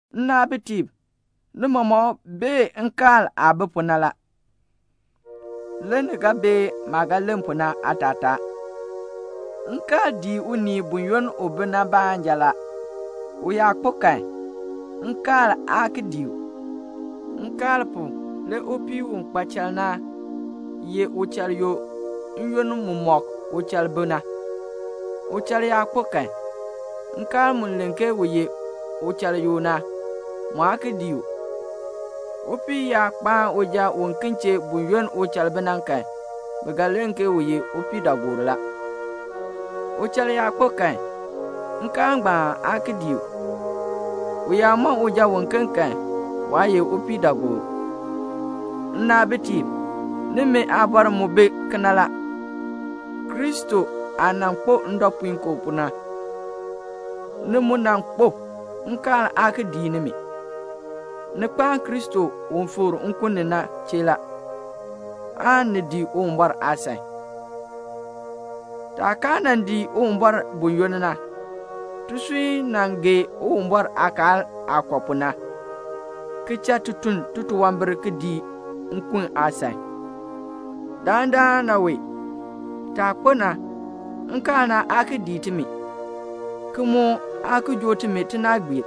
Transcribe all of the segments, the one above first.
Nnaabitiib, ni mɔmɔk bee nkaal aah bi pu na la. Le ni ga bee maah ga len pu na aatataa. Nkaal dii unii buyoonn u bi na baanja la. U yaa kpo kan, nkaal aa ki dii u. Nkaal pu, le upii u kpa chal na ye uchal yoo n-yoonn mumɔk uchal bi na. Uchal yaa kpo kan, nkaal mu len ke u ye uchal yoo na, mu aa ki dii u. Upii yaa kpaan uja uken chee buyoonn uchal bi na kan, bi ga len ke u ye upiidaagoor la. Uchal yaa kpo kan, nkaal ngbaan aa ki dii u. U yaa mɔn uja uken kan, waa ye upiidaagoor. Nnaabitiib, nimi aabɔr mu bi kena la. Kristo aah nan kpo ndɔpuinkoo pu na, ni mu nan kpo; nkaal aa ki dii nimi. Ni kpaan Kristo u fikr nkun ni na chee la, aan ni dii Uwumbɔr aasan. Taah kaa nan dii Uwumbɔr buyoonn na, tisui nan gee Uwumbɔr aakaal aah kɔ pu na, ki cha ti tun titunwambir ki dii nkun aasan. Dandana wee, taah kpo na, nkaal na aa ki dii timi, ki mu aa ki joo timi tinaagbiir.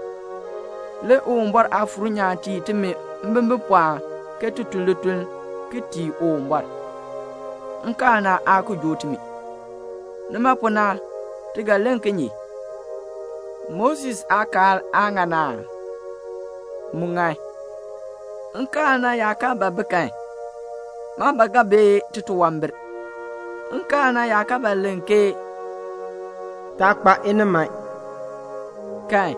Le Uwumbɔr Aafuur nyaan tii timi mbimbipɔɔn ke ti tun lituln ki tii Uwumbɔr. Nkaal na aa ki joo timi. Nima pu na ti ga len kinye? Moses aakaal aa ŋan aa? Mu ŋan. Nkaal na yaa kaa ba bi kan, maa ba ga bee titunwambir. Nkaal na yaa kaa ba len ke "Taa kpa iniman" kan,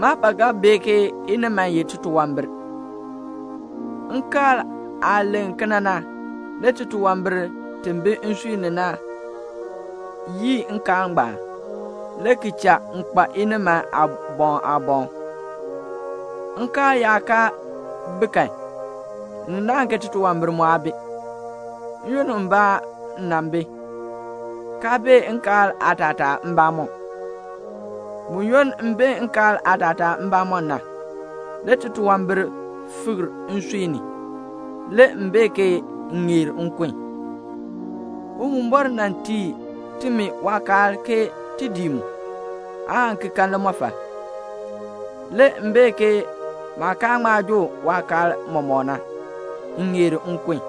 maa ba ga bee ke iniman ye titunwambir. Nkaal aah len kena na, le titunwambir ti bi nsui ni na yii nkaal ngbaan, le ki cha m kpa iniman aaboŋ aaboŋ. Nkaal yaa kaa bi kan, ni naahn ke titunwambir mu aa bi. N-yoonn mbaa m nan bi, kaa bee nkaal aatataa mbamɔm. Buyoonn m bee nkaal aatataa mbamɔm na, le titunwambir fikr nsui ni. Le m bee ke m ŋeer nkun. Uwumbɔr nan tii timi waakaal ke ti dii mu, aan ki kan limɔfal. Le m bee ke maah kaa ŋma joo waakaal mɔmɔk na, m ŋeer nkun.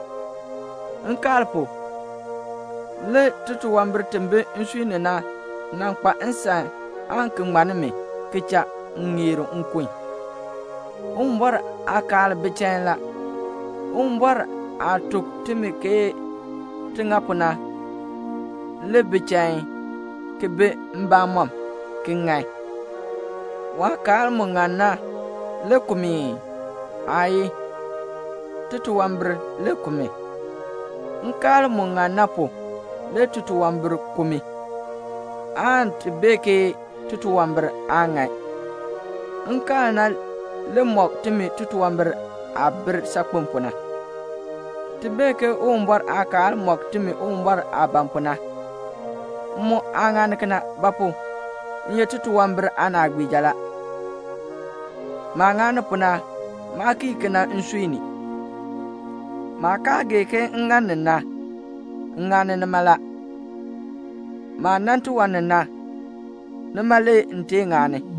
Nkaal pu, le titunwambir ti bi nsui ni na nan kpa nsan aan ki ŋmann mi, ki cha m ŋeer nkun. Uwumbɔr aakaal bi chain la. Uwumbɔr aah tuk timi ke ti ŋa pu na le bi chain, ki bi mbamɔm, ki ŋan. Waakaal mu ŋan na le ku mi ii? Aayii. Titunwambir le ku mi. Nkaal mu ŋan na pu, le titunwambir ku mi, aan ti bee ke titunwambir aa ŋan. Nkaal na le mɔk timi titunwambir aah bir saakpen pu na. Ti bee ke Uwumbɔr aakaal mɔk timi Uwumbɔr aah ban pu na. M mu aa ŋani kena; ba pu? m ye titunwambir aanaagbiija la. Maah ŋani pu na, maa kii kena nsui ni. Maah kaa gee ke m ŋani na, m ŋani nima la. Maah nan tiwan ni na, nima le m tee ŋani.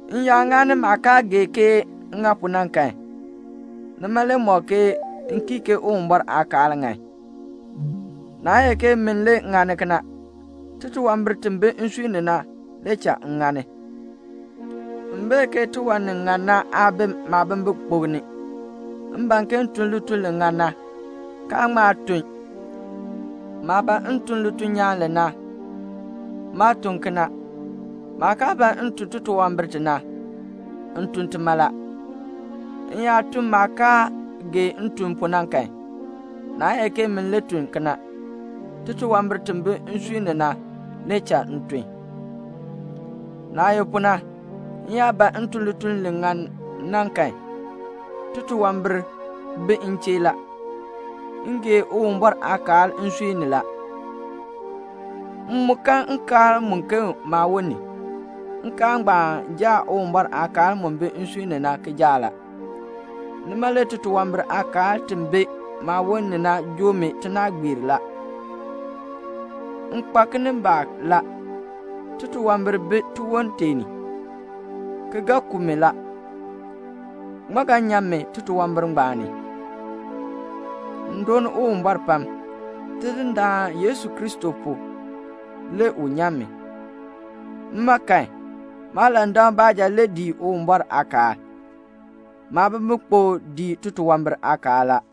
M yaa ŋani maah kaa gee ke m ŋani na kan, nima le mɔk ke m kii ke Uwumbɔr aakaal ŋan. Naa ye ke min le ŋani kena, titunwambir ti bi nsui ni na le cha m ŋani. M bee ke tiwan ni ŋan na aa bi maabimbikpok ni; m ban ke m tun lituln li ŋan na, kaa ŋma tun. Maah ban m tun lituln nyaan li na, maa tun kena. Maah kaa ban m tun titunwambir ti na, m tun tima la. M yaa tun maah kaa gee m tun pu na kan, naa ye ke min le tun kena, titunwambir ti bi nsui ni na le cha m tun. Naah ye pu na, m yaa ban m tun lituln li ŋan na kan, titunwambir bi m chee la. M gee Uwumbɔr aakaal nsui ni la. M mu kan nkaal muken maawon ni. Nkaal ngbaan jaa Uwumbɔr aakaal mu bi nsui ni na kijaak la. Nima le titunwambir aakaal ti bi maawon ni na joo mi tinaagbiir la. M kpa kinimbaak la. Titunwambir bi tiwon tee ni, ki ga ku mi la. Ŋmaa ga nyan mi titunwambir ngbaan ni? M dooni Uwumbɔr pam, Tidindaan Yesu Kristo pu, le u nyan mi. Mma kan, maalandak baanja le dii Uwumbɔr aakaal. Maabimbikpok dii titunwambir aakaal la.